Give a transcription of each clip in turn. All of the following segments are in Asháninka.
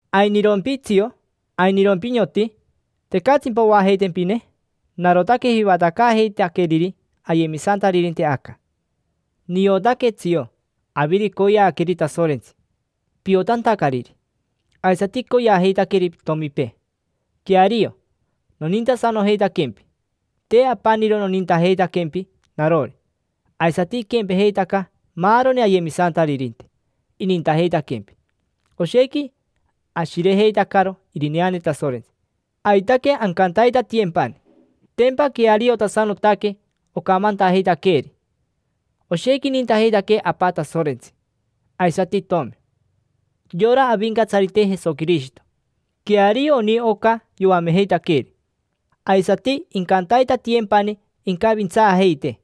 ¿Ainirompi tsio? ¿Ainirompi, nioti? ¿Tecatsimpa oajeitempine? Narotaque jivatacaajeitaqueriri ayemisantaririnte aca. Niotaque, tsio, aviro icoyeaque Tasorentsi piotantacariri, aisati icoyeajeitaqueri pitomipee. Queario, nonintasanojeitaquempi. Te apaniro nonintajeitaquempi narori, aisati iquempejeitaca maaroni ayemisantaririnte: inintajeitaquempi. Oshequi ashirejeitacaro irineane Tasorentsi, aitaque ancantaitatiyempani, tempa queariotasanotaque ocamantajeitaqueeri. Oshequi inintajeitaquee Apa Tasorentsi, aisati itomi, yora Avincatsarite Jesoquirishito, queario oni oca yoamejeitaqueeri. Aisati incantaitatiyempani incavintsaajeitee,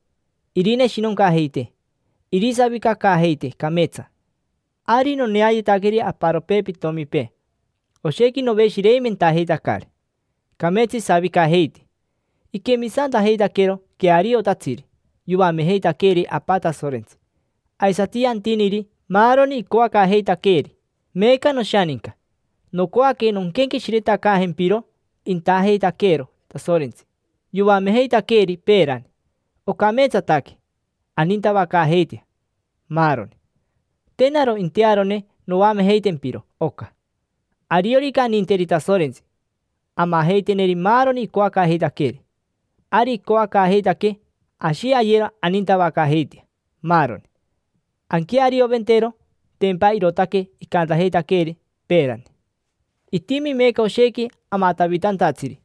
irineshinoncajeitee, irisavicacaajeitee cameetsa. Ari noneayetaqueri aparopee pitomipee, oshequi noveshireimentajeitacari. Cameetsa isavicajeiti, iquemisantajeitaquero queariotatsiri yoamejeitaqueeri Apa Tasorentsi, aisati yantiniri maaroni icoacaajeitaqueeri. Meeca, noshaninca, nocoaque nonquenqueshiretacaajempiro intajeitaqueero Tasorentsi yoamejeitaqueeri peerani: ocameetsataque anintavacaajeitea, maaroni. Te naro intearone noamejeitempiro oca. Ariorica aninteri Tasorentsi, amajeiteneri maaroni icoacaajeitaqueeri. Ari icoacaajeitaquee ashi ayero anintavacaajeitea, maaroni, anquearioventero. Tempa irootaque icantajeitaqueeri peerani. Itimi meeca oshequi amatavitantatsiri,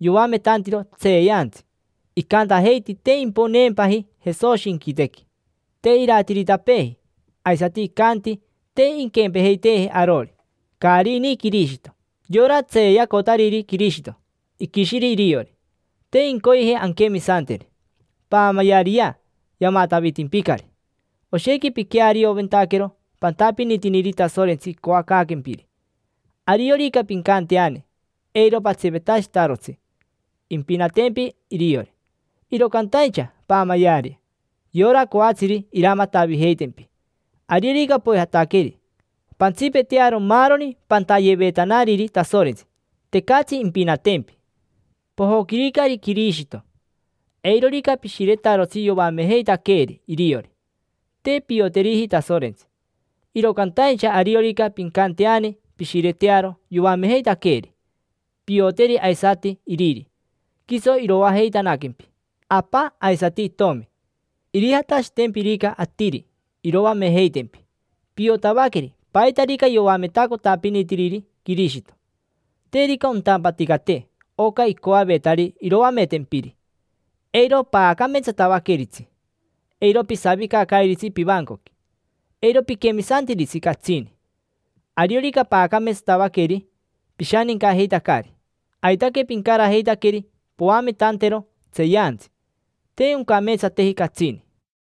yoametantiro tseeyantsi, icantajeiti te imponeempaji Jesoshi inquitequi, te iratiritapeeji. Aisati icanti te inquempejeiteeji arori, caari ini Quirishito. Yora tseeyacotariri Quirishito iquishiri iriori, te incoyeji anquemisanteri. Paamayeariyea: yamatavitimpicari. Oshequi piquearioventaquero pantapinitiniri Tasorentsi icoacaaquempiri; ariorica pincanteani, eiro patsipetashitarotsi, impinatempi iriori. Iro cantaincha paamayeari yora coatsiri iramatavijeitempi: ariorica poijataqueri, pantsipetearo maaroni pantayevetanariri Tasorentsi, tecatsi impinatempi. Pojoquiricari Quirishito: eirorica pishiretarotsi yoamejeitaqueeri iriori, te pioteriji Tasorentsi. Iro cantaincha ariorica pincanteani pishiretearo yoamejeitaqueeri, pioteri aisati Iriri: quiso iroajeitanaquempi Apa aisati Itomi. Irijatashitempirica atiri iroamejeitempi, piotavaqueri paitarica yoametacotapinitiriri Quirishito. Terica ontampaticate oca icoavetari iroametempiri, eiro paacameetsatavaqueritsi: eiro pisavicacairitsi pivancoqui, eiro piquemisantiritsi catsini. Ariorica paacameetsatavaqueri, pishanincajeitacari: aitaque pincarajeitaqueri poametantero tseeyantsi. Te oncameetsateji catsini.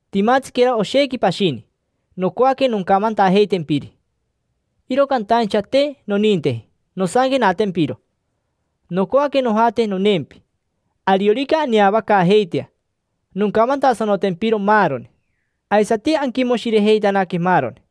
Timatsiquera oshequi pashini nocoaque noncamantajeitempiri, iro cantaincha te noninteji nosanquenatempiro. Nocoaque nojate noneempi. Ariorica aneavacaajeitea, noncamantasanotempiro maaroni. Aisati anquimoshirejeitanaque maaroni.